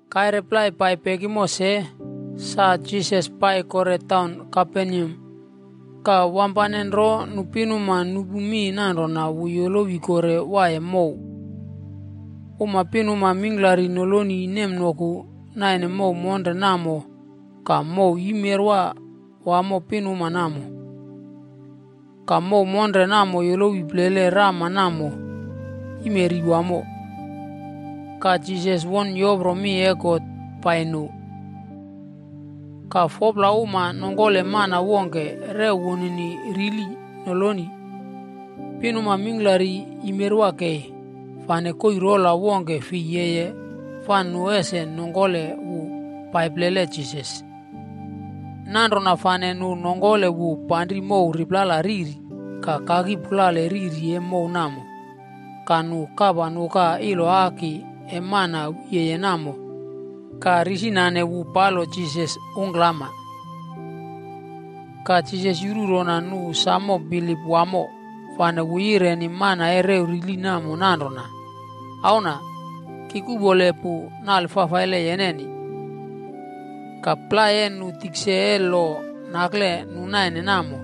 Kaire plai pai pekimo se, sa Jisas pai kore taun Kaperneam. Ka wampane nro nu pinuma nupu mi nanrona wu yolowi kore waiye mow. Uma pinuma mingklari noloni nemnoku naine mow monre namo ka mow yimerwa wamo pinuma namo. Ka mow monre namo yolowi plele rama namo yimeri wamo. Ka Jisas won yopro mi e God pai nu. Ka 4pla uma nongkole mana wongke rew wunini rili noloni. Pinuma mingklari yimeri kei, fane koii rola wongke fi yeye fa nu ese nongkole wu pai plele Jisas. Nanrona fane nu nongkole wu panri mow riplala riri ka kaki pulale riri e mow namo. Ka nu kapa nuka iloaki e mana wiye namo ka risinane wu palo Jisas ungklama. Ka Jisas yuru rona nu samo bilip wamo fane wu yireni mana e rew rili namo nanrona, “Auna, ki kuꞌpole pu nale fafaile yeneni.” Ka plai e nu tikse e lo nakle nu naine namo,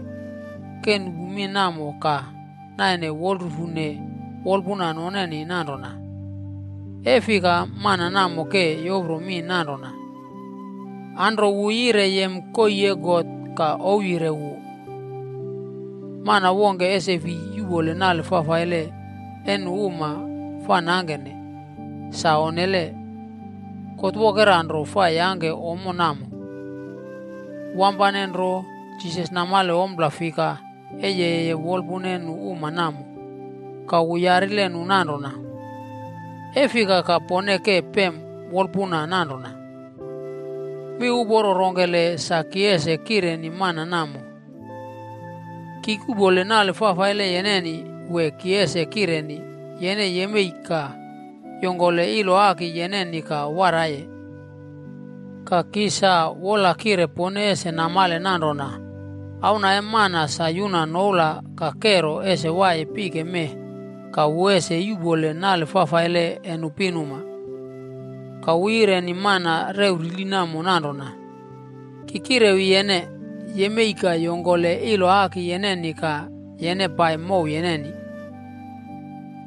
ke nupu mi namo ka naine wolrufune wolpuna noneni nanrona, “E fika mana namo ke yopro mi nanrona? Anro wu yire yem koii e God ka ouwyire wu. Mana wongke ese fi yuꞌpole nale fafaile e nu uma fa nangkene! Sa onnele, God wokera nro fa yangke ommo namo.” Wampane nro Jisas namale ompla fika e yeye wolpuna e nu uma namo ka wu yarile nu nanrona, “E fika ka pone ke pem wolpuna nanrona? Mi uporo rongkele sa ki ese kireni mana namo? ‘Ki kuꞌpole nale fafaile yeneni,’ wee ki ese kireni, ‘Yene yemei ka yongkole iloaki yeneni ka waraiye’? Ka ki sa wola kire pone ese namale nanrona Auna E Mana sa yuna noula ka kero ese waiye pike mee ka wu ese yuꞌpole nale fafaile e nu pinuma.” Ka wu yireni mana rew rili namo nanrona, “Ki kirewi yene, yemei ka yongkole iloaki yeneni ka yene pai mow yeneni.”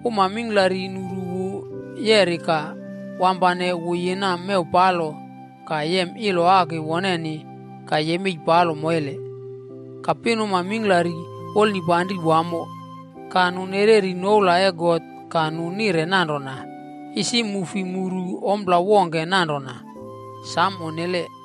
Uma mingklari nuru wu yeri ka wampane wu yina mew palo ka yem iloaki woneni ka yemei palo moile. Ka pinuma mingklari wolnipanri wamo ka nu nereri noula e God ka nu nire nanrona, “Isi mu fi muru ompla wongke nanrona. Sam onnele!”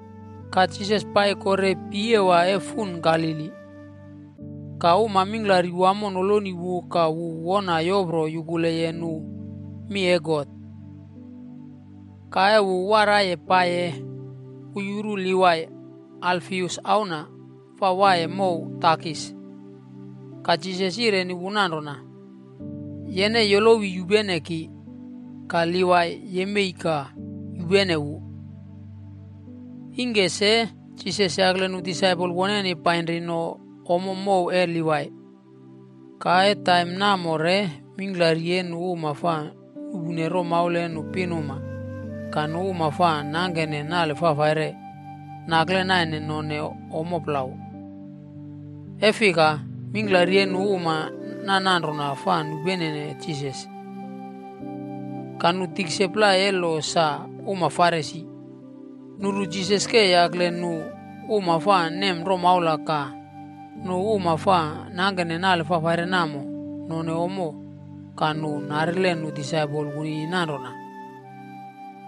Ka Jisas pai kore piyewa e fun Galili. Ka uma mingklari wamo noloni wu ka wu wona yopro yukuleye nu mi e God. Ka e wu waraiye paiye, wu yuru Livai, Alfius auna, fa waiye mow takis.a Ka Jisas yireni wu nanrona, “Yene yolowi yupene ki.” Ka Livai yemei ka yupene wu. Ingke se Jisas yakle nu disaipol woneni painri no ommo mow e Livai. Ka e taim namo re mingklari e nu uma fa nuꞌpune romaula e nu pinuma ka nu uma fa nangkene nale fafaire, nakle naine none ommo plau.b E fika, mingklari e nu uma nananrona fa nupenene Jisas. Ka nu tikse plai e lo sa uma Farisi, nuru Jisas ke yakle nu uma fa nem romaula ka nu uma fa nangkene nale fafaile namo none ommo ka nu narile nu disaipol wunini nanrona,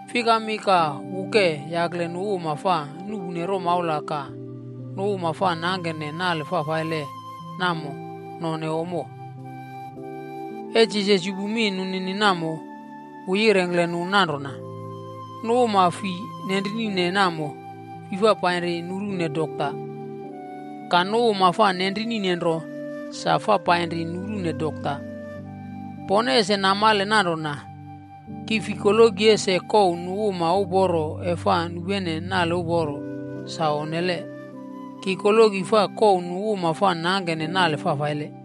Fikami ka wu ke yakle nu uma fa nuꞌpune romaula ka nu uma fa nangkene nale fafaile namo none ommo? E Jisas yupu mi nunini namo, wu yirengkle nu nanrona, “Nu uma fi nenrinine namo, fi fa painri nurune dokta. Ka nu uma fa nenrinine nro sa fa painri nurune dokta. Pone ese namale nanrona, ki fi koloki ese kouw nu uma uporo e fa nupene nale uporo. Sa onnele. Ki koloki fa kouw nu uma fa nangkene nale fafaile.”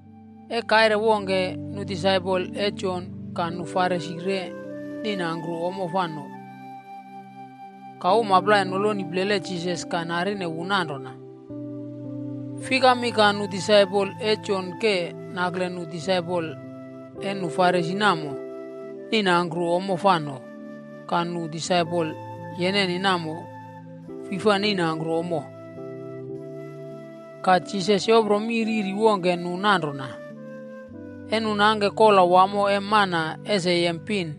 E kaire wongke, nu disaipol e Jon ka nu Farisi re neinangkru ommo fa none. Ka uma plai noloni plele Jisas ka narine wu nanrona, “Fikami ka nu disaipol e Jon ke nakle nu disaipol e nu Farisi namo neinangkru ommo fa none, ka nu disaipol yeneni namo, fi fa neinangkru ommo?” Ka Jisas yopro mi riri wongke nu nanrona, “E nu nangke kola wamo e mana ese yem pin,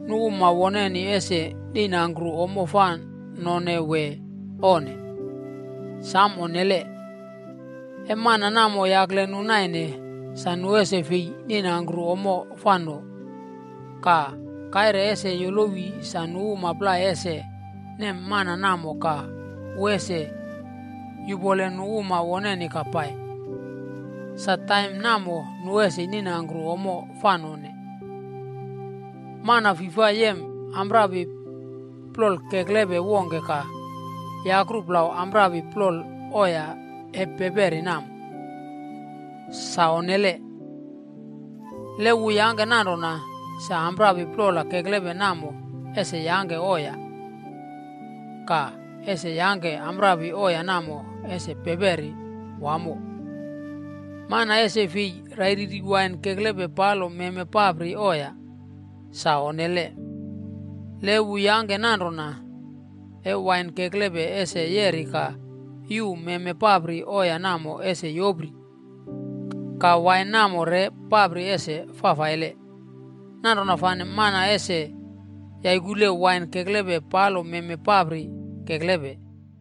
nu uma woneni ese neinangkru ommo fa none wee onne? Samo onnele! E mana namo yakle nu naine, sa nu ese fei neinangkru ommo fa none. Ka kaire ese yolowi sa nu uma plai ese nem mana namo ka wu ese yupole nu uma woneni ka pai. Sa taim namo nu ese neinangkru ommo fa none. “Mana fi fa yem amprapi plol keklepe wongke ka yakru plau amprapi plol oya e peperi namo. Sa onnele! Le wu yangke nanrona, sa amprapi plol keklepe namo ese yangke oya, ka ese yangke amprapi oya namo ese peperi wamo. Mana ese fei rairiri wain keklepe palo meme papri oya. Sa onnele! Le wu yangke nanrona, e wain keklepe ese yeri ka yuu meme papri oya namo ese yopri. Ka wain namo re papri ese fafaile. Nanrona fane, mana ese yaikule wain keklepe palo meme papri keklepe.”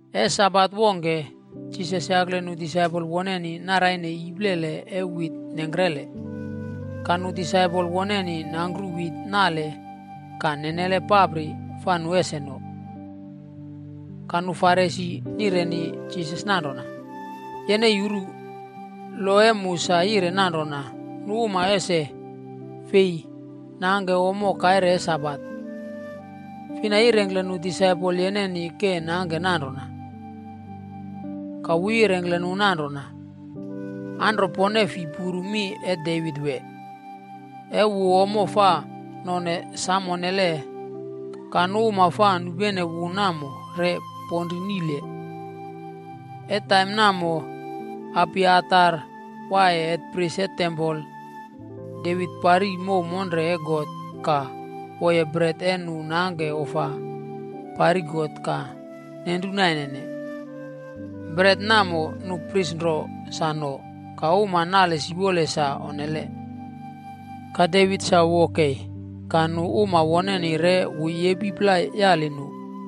E Sabat wongke, Jisas yakle nu disaipol woneni naraine iplele e wit nengkre. Ka nu disaipol woneni nangkru wit nale ka nenelene papri fa nu ese no. Ka nu Farisi nireni Jisas nanrona, “Yene yuru, lo e mu sa yire nanrona nu uma ese fei nangke ommo kaire e Sabat. Fina yirengkle nu disaipol yeneni ke nangke nanrona?” Ka wu yirengkle nu nanrona, “Anro pone fi puru mi e Devit wee? E wu ommo fa nonene sam onnele ka nu uma fa nupene wu namo re ponrinile. E taim namo Abiatar waiye hetpris e tempol. David pari mow monre e God, ka woye bret e nu nangke ofa pari God ka nenru nainene. Bret namo nu pris nro sa none, ka uma nale siwole sa onnele. Ka Davit sa wo kei, ka nu uma woneni re wu yepi plai yali nu.”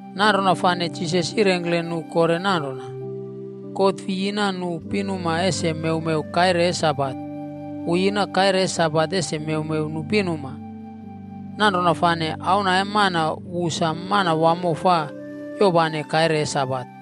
Nanrona fane Jisas yirengkle nu kore nanrona, “God fi yina nu pinuma ese mewmew kaire e Sabat. Wu yina kaire e Sabat ese mewmew nu pinuma. Nanrona fane Auna e Mana wu sa Manawamo fa yopane kaire e Sabat.”